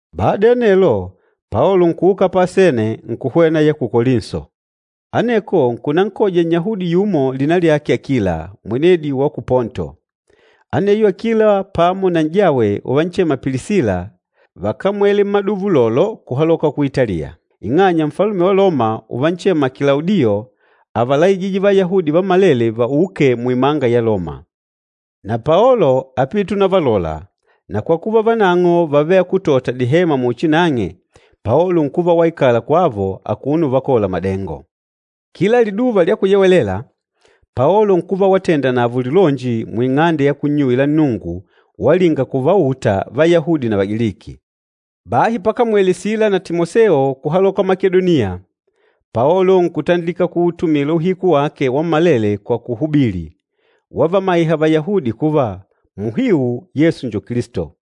Bada ya anelo, Paolo nkuuka pa Asene nkuhwena ya ku Kolinso. Aneko nkunankoja Nnyahudi yumo lina lyake Akila, mwenedi wa ku Ponto. Aneyo Akila pamo na n'jawe uvanchema Pilisila, vákamwele mmaduva ulolo kuhaloka ku Italiya, ing'anya Nfalume wa Loma uvanchema Kilaudiyo ávalaijije Vayahudi vammalele vauke muimanga ya Loma. Na Paolo ápite unavalola, na kwa kuva vanang'o vávele akútota dihema muchi nang'e, Paolo nkuva waikala kwavo akuno uvakola madengo. Kila Liduva lya Kuyewelela, Paolo nkuva watenda navo lilonji muing'ande ya kunnyuwila Nnungu walinga kuvauta Vayahudi na Vagiliki. Bahi pakamwele Sila na Timoseo kuhaloka ku Makedoniya, Paolo nkutandilika kuutumila uhiku wake wammalele kwa kuhubili, wavamaiha Vayahudi kuva, muhiu Yesu njo Kilisto.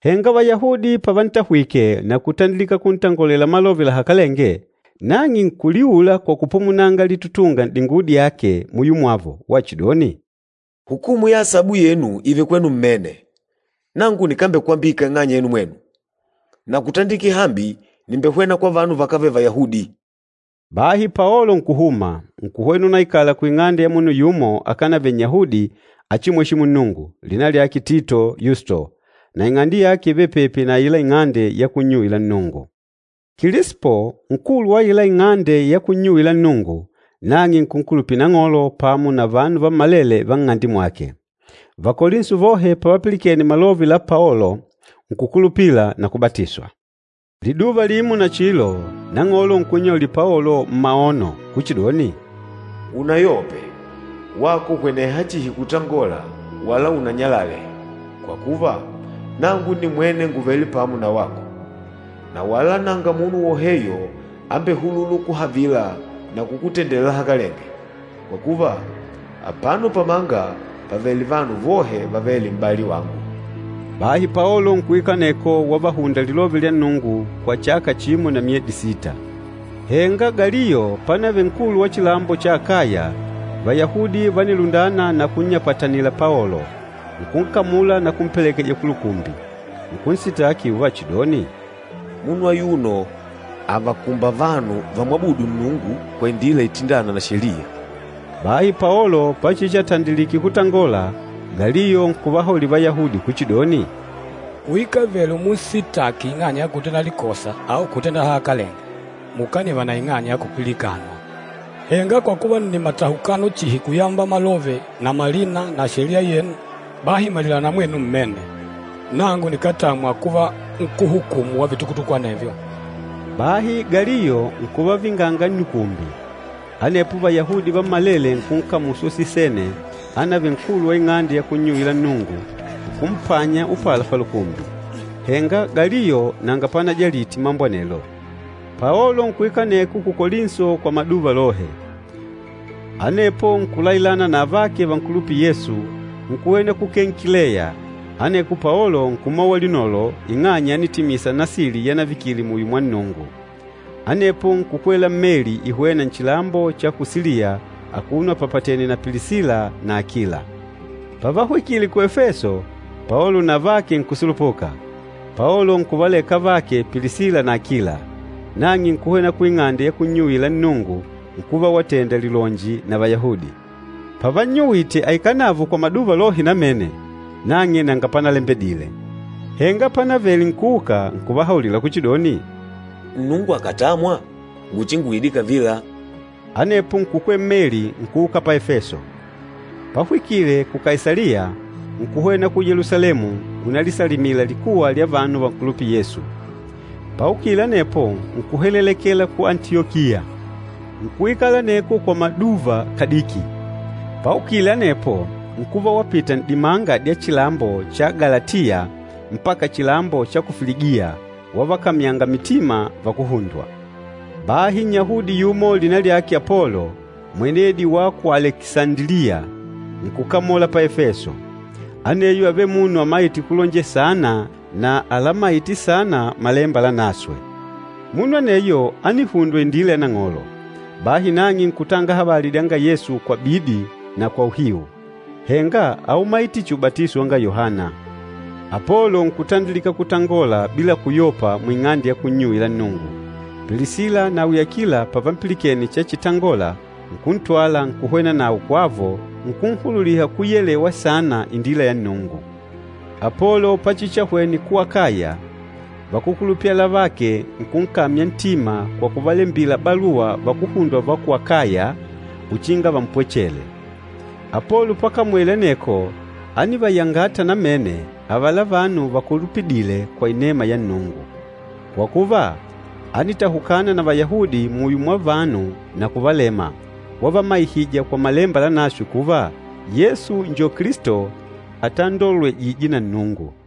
Henga Vayahudi pavantahwike na kutandilika kuntangolela malove lahakalenge, nang'e nkuliula kwa kupumunanga litutunga n'dinguwo dyake muyo mwavo wachidoni, “Hukumu ya asabu yenu ììve kwenu mmene! Nangu nikambekwambika ing'anya yenu mwenu, na kutandikila hambi nìmbehwena kwa vanu vakávele Vayahudi.” Bahi Paolo nkuhuma, nkuhwena unaikala kuing'ande ya munu yumo akanavele Nnyahudi achimweshîmu Nnungu, lina lyake Tito Yusto, na ing'ande yake ívele pepi na aila ing'ande ya kunnyuwila Nnungu. Kilispo, nkulu wa aila ing'ande ya kunnyuwila Nnungu, nang'e nkunkulupila Nang'olo pamo na vanu vammalele va nng'ande mwake. Vakolinso vohe pavapilikene malove la Paolo, nkukulupila na kubatiswa. Liduva limo nachilo, Nang'olo nkunnyaulila Paolo mmaono kuchidoni, “Unayope, wako hweneha chihi kutangola wala unanyalale, kwa kuva, nangu nimwene ngùvele pamo na wako. Na wala nanga munu woheyo ambehulûla ukuhavila na kukutendela lahakalenge, kwa kuva, apano pamanga pàvele vanu vohe vavêle m'bali wangu.” Bahi Paolo nkuikala aneko wavahunda Lilove lya Nnungu kwa chaka chimo na myedi sita. Henga Galiyo panavele nkulu wa chilambo cha Akaya, Vayahudi vánilundana na kunnyapatanila Paolo, nkunkamula na kumpelekeja kulukumbi. Nkunsitaki uvachidoni, “Munu ayuno àvakumba vanu vámwabùdù Nnungu kwa indila itindâna na sheliya.” Bahi Paolo pachichiatandilike kutangola, Galiyo nkuvahaulila Vayahudi kuchidoni, “Kuikavele umunsitaki ing'anya ya kutenda likosa au kutenda lahakalenge, mukaniva na ing'anya ya kupilikanwa. Henga kwa kuva nni matahukano chihi kuyamba malove na malina na sheliya yenu, bahi malilana mwenu mmene. Nangu nikátamwa kuva nkúhumu wa vitukutuku anevyo!” Bahi Galiyo nkuvavinganga nnukumbi. Anepo Vayahudi vammalele nkunkamula Sosisene anavele nkulu wa ing'ande ya kunnyuwila Nnungu, nkumpanya upala palukumbi. Henga Galiyo nanga panajalite mambo anelo. Paolo nkuikala aneko ku Kolinso kwa maduva lohe. Anepo nkulailana na avake vankulupîla Yesu, nkuhwena ku Kenkileya, aneko Paolo nkumowa linolo ing'anya ánitimisa nasili yanavikile muyo mwa Nnungu. Anepo nkukwela mmeli ihwêna nchilambo cha ku Siliya akuno apapatènè na Pilisila na Akila. Pavahwikile ku Efeso, Paolo na avake nkusulupuka, Paolo nkuvaleka avake Pilisila na Akila. Nang'e nkuhwena kuing'ande ya kunnyuwila Nnungu, nkuva watenda lilonji na Vayahudi. Pavannyuwite aikale navo kwa maduva lohe namene, nang'e nanga panalembedile. Henga panavele nkuuka, nkuvahaulila kuchidoni, “Nnungu akàtamwa, nguchinguide kavila.” Anepo nkukwela mmeli nkuuka pa Efeso. Pahwikile ku Kaisaliya, nkuhwena ku Yelusalemu unalisalimila likuwa lya vanu vankulupîla Yesu. Paukile anepo nkuheleleke ku Antiyokiya. Nkuikala aneko kwa maduva kadiki, paukile anepo nkuva wapita n'dimanga dya chilambo cha Galatiya mpaka chilambo cha ku Filigiya, wavakamyanga mitima vakuhundwa. Bahi Nnyahudi yumo lina lyake Apolo, mwenedi wa ku Alekisandiliya, nkukamola pa Efeso. Aneyo ávele munu amaîte kulonjela saana na alamaîte saana Malemba Lanaswe. Munu aneyo ánihundwa indila ya Nang'olo, bahi nang'e nkutanga habali dyanga Yesu kwa bidi na kwa uhiu, henga áumaite chihi ubatiso wanga Yohana. Apolo nkutandilika kutangola bila kuyopa muing'ande ya kunnyuwila Nnungu, Pilisila nawi Akila pavampilikene chachitangola nkuntwala nkuhwena nawe kwavo nkunhululiha kuyelewa saana indila ya Nnungu. Apolo pachichiahwene ku Akaya, vakúkulupila avake nkunkamya ntima kwa kuvalembila baluwa vakuhundwa va ku Akaya uchinga vampwechele. Apolo pakamwele aneko ánivayangata namene avala vanu vakulupidîle kwa inema ya Nnungu. Kwa kuva, ánitahukana na Vayahudi muyo mwa vanu na kuvalema, wavamaihija kwa Malemba Lanaswe kuva Yesu njo Kilisto atandolwejîje na Nnungu.